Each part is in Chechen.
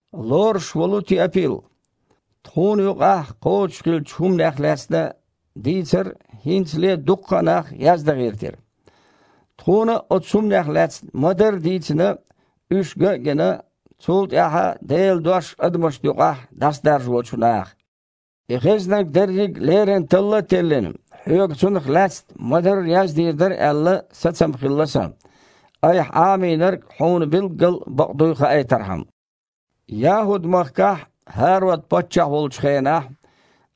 Лоруш волу Теапил, Тхуна юкъахь кхочушхиллачу хІуманех лаьцна дийцар хІинцале а дукха нах яздан гІиртира. Тхуна а оцу хІуманех лаьцна ма-дарра дийцина, уьш ган а гина, цул тІаьхьа Делан Дош адамашна юкъахь дІасадаржочу наха. И хезнарг дерриг леррина талла а теллина, хьоьга цунах лаьцна ма-дарра яздийр дара аьлла, сацам хилла сан, айхьа Іамийнарг хьуна билггала бакъ дуй хаийтархьама. ЯхІуд-махкахь ХІарод паччахь волчу хенахь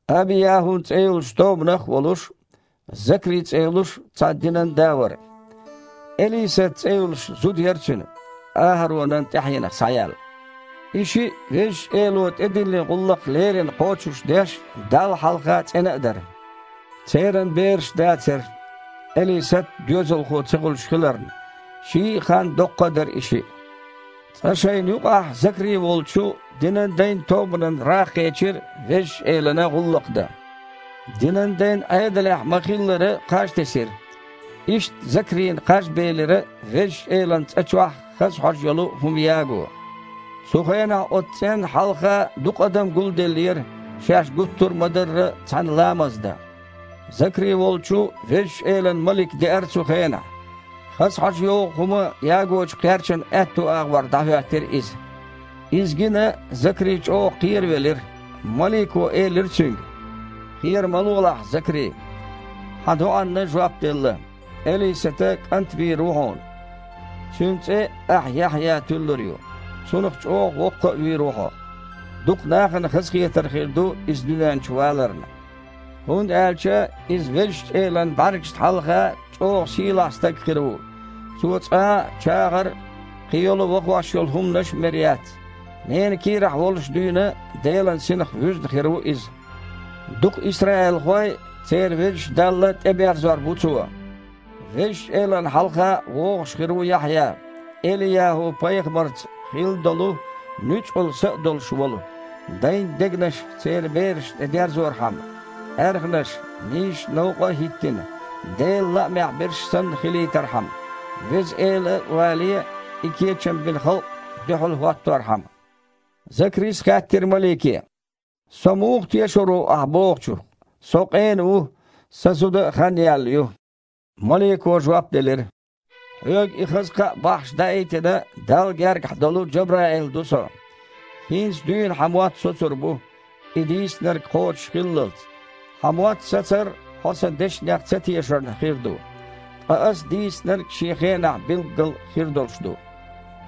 АбияхІун цІе йолчу тобанах а волуш, Закри цІе йолуш цхьа динан да вара. Элисат цІе йолуш зуда яра цуьнан, АхІаронан тІаьхьенах схьаяьлла. И шиъ Везачу Эло тІедиллина гІуллакх леррина кхочушдеш а, Далла хьалха цІена а дара. Церан бераш дацара, Элисат доьзалхо ца хуьлуш хиларна. Ший а ханна доккха а дара и шиъ. Цкъа шайна юкъахь Закри волчу динан дайн тобанан рагІ кхечира Везачу Элана гІуллакх дан. Динан дайн Іедалехь ма-хиллара, кхаж тесира. Иштта Закрина кхаж белира Везачу Элан цІа чохь хаза хьожа йолу хІума яго. Цу хенахь оцу цІенна хьалха дукха адам гулделлера, шаьш гуттар а ма-дарра, цхьаьна ламаз дан. Закри волчу Везачу Элан малик деара цу хенахь. Хаза хьожа йогІу хІума ягочу кхерчана аьтту агІор дІахІоьттира иза. Иза гина Закри чІогІа кхеравелира. Малико элира цуьнга: «Кхера ма лолахь, Закри! Хьан доІанна жоп делла: Элисата кІант вийр ву хьуна. Цуьнан цІе ахь Яхьъя туьллур ю. Цунах чІогІа воккха а вийр ву хьо. Дукха нахана хазахетар хир ду иза дуьнен чу валарна. ХІунда аьлча иза Везачу Элан бІаьргашна хьалха чІогІа сийлахь стаг хир ву, цо цкъа а чагІар а, кхин йолу вахош йолу хІуманаш а мер яц. Ненан кийрахь волуш дуьйна Делан Синах вуьзна хир ву иза. Дукха исраилхой церан Везачу Далла тІеберзор бу цо. Везачу Элана хьалха вогІуш хир ву Яхьъя, ЭлияхІу-пайхамарца хилла долу нуьцкъала са а долуш волу, дайн дегнаш церан берашна тІе дерзорхьама, аьрханаш, нийсачу новкъа а хІиттина, Делан лаамехь берш санна хилийтархьама, Веза Эла вале, и кечам бина халкъ дуьхьал хІотторхьама». Закрис хаьттира малике: «Со муха тешар ву ахьа бохучух? Со къена ву, сан зуда а хан яьлла ю». Малико жоп делира: «Хьоьга и хаза кхаъ бахьаш даийтина, Далла гергахь долу Джабраил ду со. ХІинца дуьйна хьан мотт соцур бу, и дийцинарг кхочуш хиллалц. Хьан мотт сацар хьо сан дешнех ца тешарна хир ду, ткъа ас дийцинарг шен хенахь билггала хир долуш ду».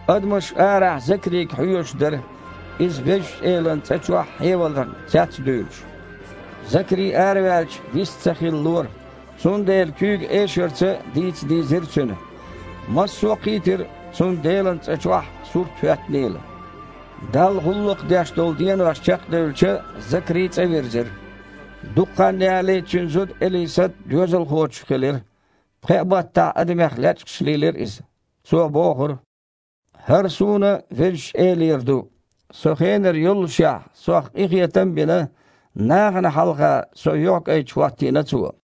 Адамаш арахь Закрига хьоьжуш дара, иза Везачу Элан цІа чохь хьеваларна цец а дуьйлуш. Закри, араваьлча, вист ца хилалора, цундела куьйга эшарца дийца дийзира цуьнан. Массо а кхийтира, цунна Делан цІа чохь сурт хІоьттинийла. Далла гІуллакх деш долу денош чекхдевлча, Закри цІа вирзира. Дукха хан ялале цуьнан зуда Элисат доьзалхочух хилира. Пхеа баттахь адамех лечкъаш лийлира иза. Цо бохура: «ХІара суна Везачу Элера ду! Со хенара йоллушехь, сох къинхетам а бина, нахана хьалха со юьхькІайчу хІоттийна Цо».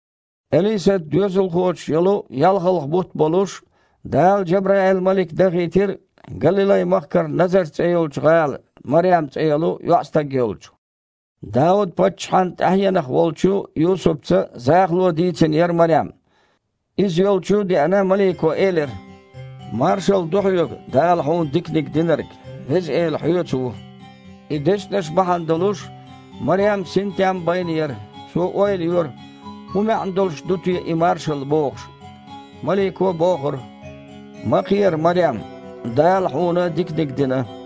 Элисат доьзалхочух йолу ялхалгІа бутт болуш, Дала Джабраил-малик дахийтира Галилай-махкара Назарт цІе йолчу гІала Марем цІе йолу йоІстаг йолчу. Дауд-паччахьан тІаьхьенах волчу Юсупца захало дийцина яра Марем. Иза йолчу а деана, малико элира: «Маршалла ду хьоьга, Дала хьуна диканиг динарг! Веза Эла хьоьца ву!» И дешнаш бахьана долуш, Марем синтем байна яра, цо ойла йора, хІун маьІна долуш ду и маршалла бохуш. Малико бохура: «Ма кхера, Марем! Дала хьуна диканиг дина!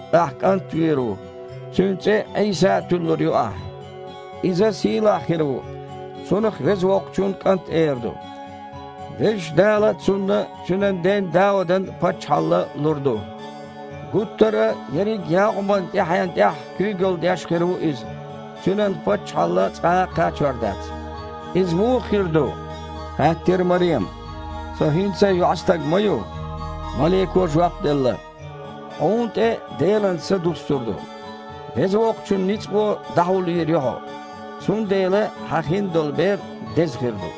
Ахь кІант вийр ву, цуьнан цІе Іийса а туьллур ю ахь. Иза сийлахь хир ву, Цунах Веза Воккхачун КІант эр ду. Везачу Дала Цунна Цуьнан ден Даудан паччахьалла лур ду, гуттар а ерриг Якъубан тІаьхьенна тІехь куьйгалла деш хир ву Иза, Цуьнан паччахьалла цкъа а кхачор дац». «Иза муха хир ду, – хаьттира Марема, – со хІинца а йоІстаг ма ю?» Малико жоп делла: «Хьуна тІе Делан Са дуьссур ду, Веза Воккхачун ницкъо дІахьулйийр ю хьо, цундела хьан хиндолу бер Деза хир ду,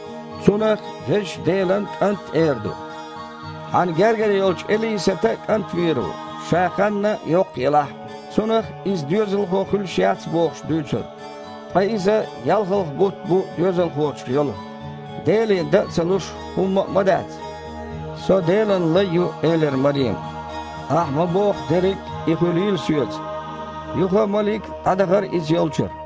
Цунах Везачу Делан КІант а эр ду. Хьан гергара йолчу Элисата а кІант вийр ву, ша ханна йоккха елахь а. Цунах, иза доьзалхо хуьлуш яц бохуш, дуьйцура, ткъа иза ялхалгІа бутт бу доьзалхочух йолу. Деле дан а ца луш хІумма а ма дац!» «Со Делан лай ю, – элира Марема, – ахь ма-бохху, дерриг и хуьлийла соьца». Юха малик дІадахара иза йолчуьра.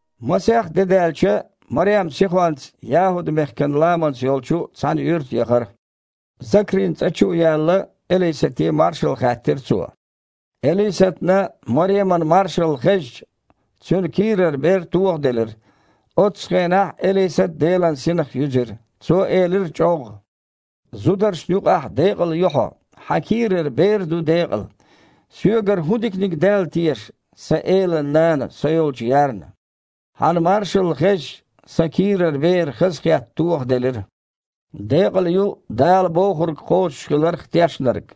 Масех де даьлча, Марем сихонца ЯхІуд-мехкан ламанца йолчу цхьана юьрта яхара. Закрин цІа чу а яьлла, Элисате маршалла хаьттира цо. Элисатна Мареман маршалла хезча, цуьнан кийрара бер тохаделира. Оццу хенахь Элисат Делан Синах юьзира. Цо элира чІоггІа: «Зударшна юкъахь декъала ю хьо! Хьан кийрара бер а ду декъала! Соьгара хІун диканиг даьлла теша, сан Элан нана со йолчу ярна? Хьан маршалла хезча, сан кийрара бер хазахетта тохаделира. Декъала ю Дала бохург кхочушхиларх тешнарг!»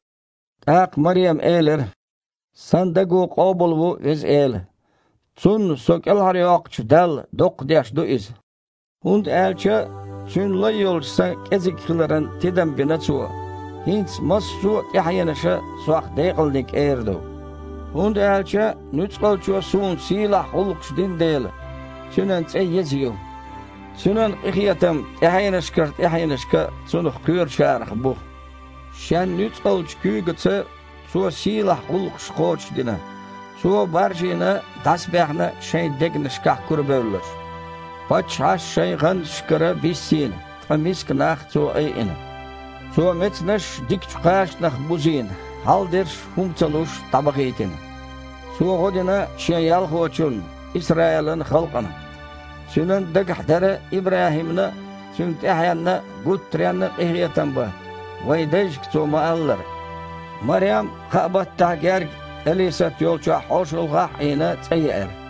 ТІаккха Марема элира: «Сан даго къобалво Веза Эла, Цунна со кІелхьарйоккхучу Далла доккхадеш ду иза, хІунда аьлча Цуьнан лай йолчу сан кІезиг хиларан тидам бина Цо! ХІинца массо а тІаьхьенаша сох декъалниг эр ду, хІунда аьлча Нуьцкъалчо суна сийлахь гІуллакхаш дина дела. Цуьнан цІе еза ю! Цуьнан къинхетам тІаьхьенашкара тІаьхьенашка Цунах кхоьручарах бу! Шен нуьцкъалчу куьйгаца Цо сийлахь гІуллакхаш кхочушдина, Цо, баржийна, дІасабаьхна шайн дегнашкахь курабевлларш, паччахьаш шайн гІанташкара биссийна, ткъа миска нах Цо айина. Цо мецанаш дикачу кхачанах бузийна, хьалдерш хІума ца луш дІабахийтина. Цо гІо дина шен ялхочунна, Исраилан халкъана. Цуьнан дагахь дара ИбрахІимна а, цуьнан тІаьхьенна а гуттаренна а къинхетам бан, вайн дайшка Цо ма-аллара». Марем, кхаа баттахь гергга Элисат йолчохь хьошалгІахь а Іийна, цІа еара.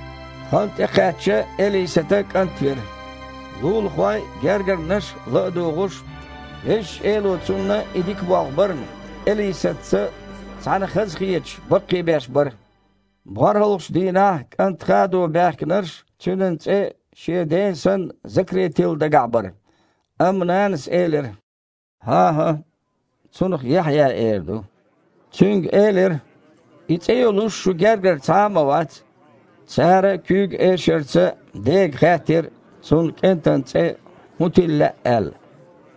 Хан тІекхаьчча, Элисата кІант вира. Лулахой а, гергарнаш а, ла а дугІуш, Везачу Эло цунна и дика болх барна, Элисатца цхьаьна хазахеташ, баккхийбеш бара. БорхІалгІачу дийнахь кІант хадо баьхкинарш цуьнан цІе шен ден санна Закри тилла дагахь бара. Амма нанас элира: «ХІан-хІа! Цунах Яхьъя эр ду». Цуьнга элира: «И цІе йолуш шун гергара цхьа а ма вац!» Цара куьйга эшарца дега хаьттира, цунна кІентан цІе хІун тилла лаьа аьлла.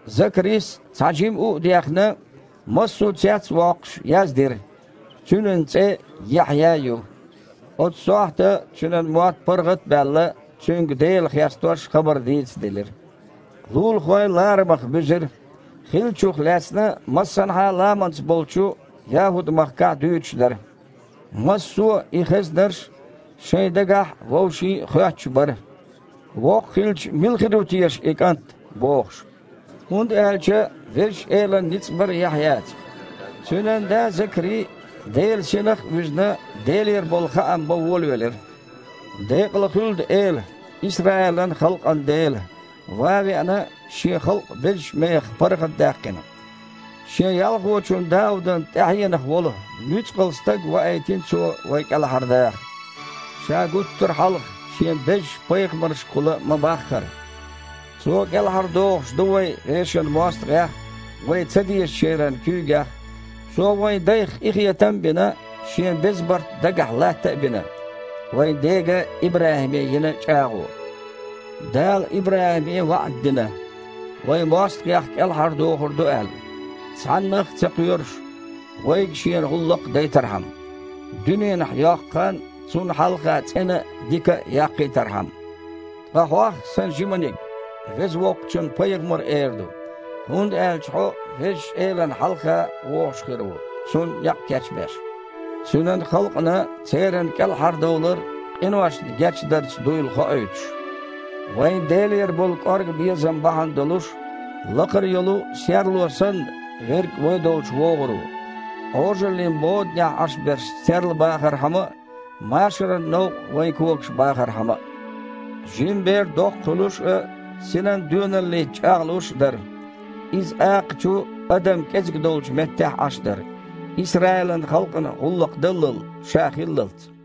Закрис, цхьа жима у а дехна, массо цец а воккхуш, яздира: «Цуьнан цІе Яхьъя ю». Оцу сохьта цуьнан мотт паргІат а баьлла, цуьнга Дела хестош хабар дийцаделира. Лулахой ларамах буьзира. Хиллачух лаьцна массанхьа а ламанца болчу ЯхІуд-махкахь дуьйцуш дара. Массо а, и хезнарш, шайн дагахь а, вовшийн а хоьттуш бара: «Воккха хилча мила хир ву теша и кІант?» – бохуш. ХІунда аьлча Везачу Элан ницкъ бара Яхьъяца. Цуьнан да Закри, Делан Синах а вуьзна, Делера болу хаам бан волавелира: «Декъала хуьлда Эла, Исраилан халкъан Дела, ван а веана, Шен халкъ безачу мехах паргІатдаьккхина. Шен ялхочун Даудан тІаьхьенах волу нуьцкъала стаг ваийтина Цо вай кІелхьардаха, Ша гуттар хьалха Шен безачу пайхамаршкахула ма-баххара. Цо кІелхьардохуш ду вай вешан мостагІех а, вай цадезачеран куьйгех а. Цо вайн дайх къинхетам а бина, Шен беза барт дагахь латта а бина – вайн дега ИбрахІиме йина чІагІо. Дала ИбрахІиме ваІда дина, вай мостагІех кІелхьардохур ду аьлла, цхьаннах а ца кхоьруш, вайга Шена гІуллакх дайтархьама, дуьненахь йоккху хан Цунна хьалха цІена а, дика а яккхийтархьама. Ткъа хьох, сан жиманиг, Веза Воккхачун пайхамар эр ду, хІунда аьлча хьо Везачу Элана хьалха вогІуш хир ву, Цунна некъ кечбеш, Цуьнан халкъана церан кІелхьардовлар къиношна гечдарца дуйла хоуьйтуш. Вайн Делера болу кІорга безам бахьана долуш, лакхара йолу серло санна Верг вай долчу вогІур ву, Іожаллин боданехь Іаш берш серлабахархьама а, машаран новкъа вайн когаш бахархьама а». Жима бер доккха хуьлуш а, синан доьналлица чІагІлуш а дара. Иза акхачу, адам кІезиг долчу меттехь Іаш дара Исраилан халкъана гІуллакх дал ша хиллалц.